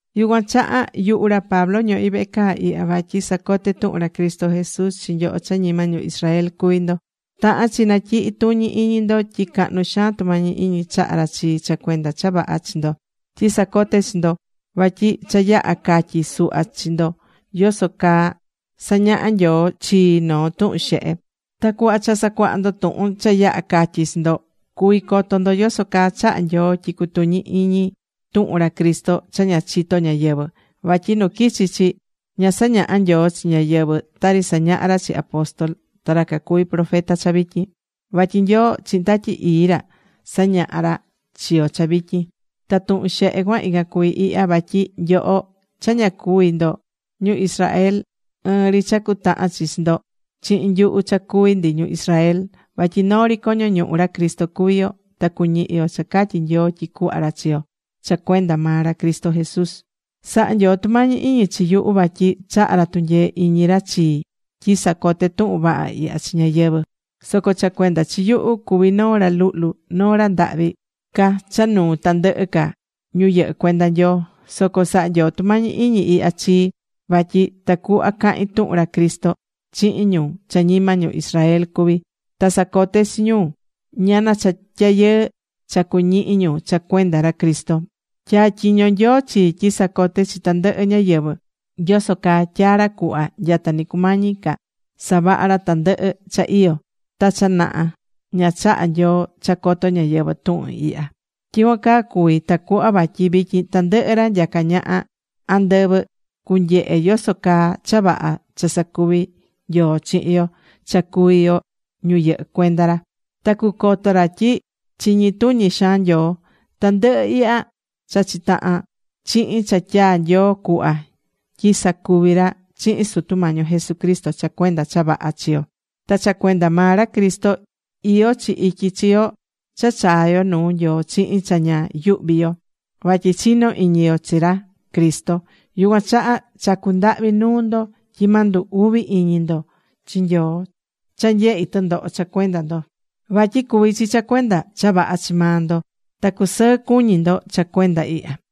Yucuan chaha yuhu ra Pablo ñohí vehe caa ihya vatyi sacoté tuhun ra Cristo Jesús chi nyoho cha ñima ñu Israel cuví ndo. Tahán chi natyihí tuñi iñi ndo tyi cahnu xaan tumañi iñi chahá ra chii cha cuenda cha vaha chi ndo, tyi sacoté chi ndo. Vatyi cha yaha catyi̱ suhva chi ndo yoso caa sañaha̱ Nyoo chii noo tuhun xehe. Ta cuhva cha sacuaha ndo tuhun cha yaha̱ catyi̱ chi ndo, cuví coto ndo yoso caa chaha̱ Nyoo tyi cutuñi iñi tuhun ra Cristo cha ña chitó ñáyɨvɨ. Vatyi nu quichi̱ chi, ña sañaha̱ Nyoo chi ñáyɨvɨ, tari sañahá ra chi apóstol ta ra cacuví profeta cha vityin. Vatyi Nyoo chihin Tatyi Ii ra sañahá ra chi yo cha vityin. Ta tuhun xehe cuan, ican cuví ihya: vatyi nyoho cha ña cuví ndo ñu Israel, ɨɨn ri cha cutahan chi chi ndo chihin nyuhu cha cuví ndi ñu Israel. Vatyi noo ri coño ñuhu ra Cristo cuví yo. Ta cuñihi yo cha catyi̱ Nyoo tyi cuhva ra chi yo cha cuenda maa ra Cristo Jesús. Saha̱ Nyoo tumañi iñi chi yuhu vatyi chaha̱ ra tunyee iñi ra chii tyi sacoté tuhun vaha ihya chi ñáyɨvɨ. Soco cha cuenda chi yuhu cuví noo ra luhlu, noo ra ndahvi ca cha nuu tandɨhɨ ca ñu yɨhɨ́ cuenda Nyoo. Soco sahá Nyoo tumañi iñi ihya chii. Vatyi tacuhva cahin tuhun ra Cristo chihin ñu cha ñima ñu Israel cuví. Ta sacoté chi ñu ñana cha tyayɨɨ cha cuñihi ñu cha cuenda ra Cristo. Tyatyiño̱ Nyoo chii tyi sacote chi tandɨhɨ ñáyɨvɨ yoso caa tyaa̱ ra cuhva nyata ni cumañi ca savaha ra tandɨhɨ cha iyó. Ta cha naha ña chaha̱ Nyoo cha coto ñáyɨvɨ tuhun ihya. Tyicuan caa cuví tacuhva vatyi vityin tandɨhɨ ra nyacá ñaha andɨvɨ cunyehe yoso caa cha vaha cha sacuví Nyoo chihin yo cha cuví yo ñu yɨhɨ́ cuenda ra. Ta cucoto ra tyi chiñi tuñi xaan Nyoo. Tandɨhɨ ihya chachí tahan chihin cha tyaa̱ Nyoo cuhva tyi sacuvi ra chihin Sutu Mañi yo Jesucristo cha cuenda cha vaha chi yo. Ta cha cuenda maa ra Cristo iyó chi ityi chi yo cha chaá yo nuu Nyoo chihin cha ña yuhví yo. Vatyi chinó iñi yo chi ra Cristo. Yucuan chaha chacú ndahvi nuu ndo tyi ma ndu uvi iñi ndo chi Nyoo cha nyehi tɨndoho cha cuenda ndo. Vatyi cuví chi cha cuenda cha vaha chi maa ndo. Ta cu̱sɨɨ cuñi ndo cha cuenda ihya.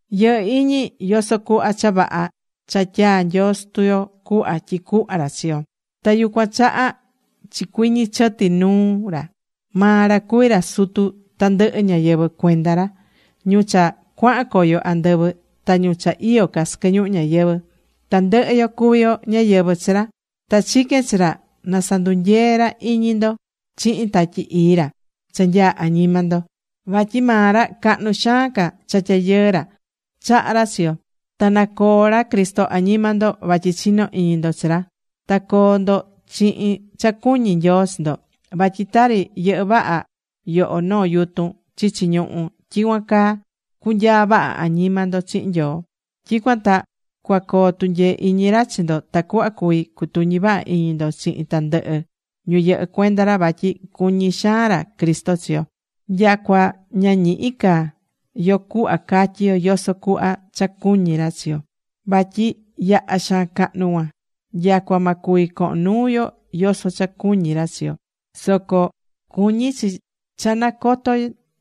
Yɨhɨ́ iñi yoso cuhva cha vaha cha tyaa̱ Nyoo Sutu yo cuhva tyi cuhva ra chi yo. Ta yucuan chaha chicuɨñɨ chɨti nuu ra. Maa ra cuví ra Sutu tandɨhɨ ñáyɨvɨ cuenda ra: ñu cha cuahan coyo andɨvɨ, ta ñu cha iyó ca sɨquɨ ñuhu ñayɨvɨ̱. Tandɨhɨ yo cuví yo ñáyɨvɨ chi ra. Ta chiquén chi ra na sandunyee ra iñi ndo chihin Tatyi Ii ra cha nyaá añima ndo. Vatyi maa ra cahnu xaan ca cha tyayɨɨ ra chahá ra chi yo. Ta na coo ra Cristo añima ndo vatyi chinó iñi ndo chi ra. Ta co̱o ndo chihin cha cuñí Nyoo chi ndo. Vatyi tari yɨhɨ́ vaha yoho noo yutun chichi ñuhú, tyicuan caa cunyaa vaha añima ndo chihin Nyoo. Tyicuan ta cuacoo tunyee iñi ra chi ndo tacuhva cuvi cutuñi vaha iñi ndo chihin tandɨhɨ ñu yɨhɨ́ cuenda ra vatyi cuñí xaan ra Cristo chi yo. Nyacua ña ñihí ca yo cuhva catyi yo yoso cuhva cha cuñí ra chi yo. Vatyi yaha xaan cahnu cuan. Nyacua ma cuvi cohon nuu yo yoso cha cuñí ra chi yo. Soco cuñí cha nacoto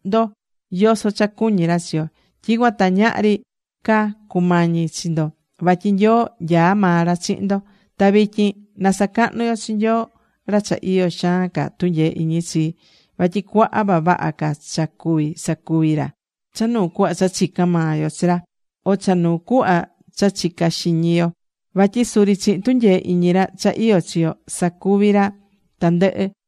ndo yoso cha cuñí ra chi yo. Tyicuan ta ñahri ca cumañi chi ndo. Vatyi Nyoo nyaá maa ra chihin ndo. Ta vityin na sacahnu yo chi Nyoo, ra cha iyó xaan ca tunyee iñi chii. Vatyi cuaha vavaha ca cha cuví sacuvi ra cha nuu cuhva cha chicán maa yo chi ra o cha nuu cuhva cha chicá xiñi yo. Vatyi suri chihin tunyee iñi ra cha iyó chi yo, sacuví ra tandɨhɨ.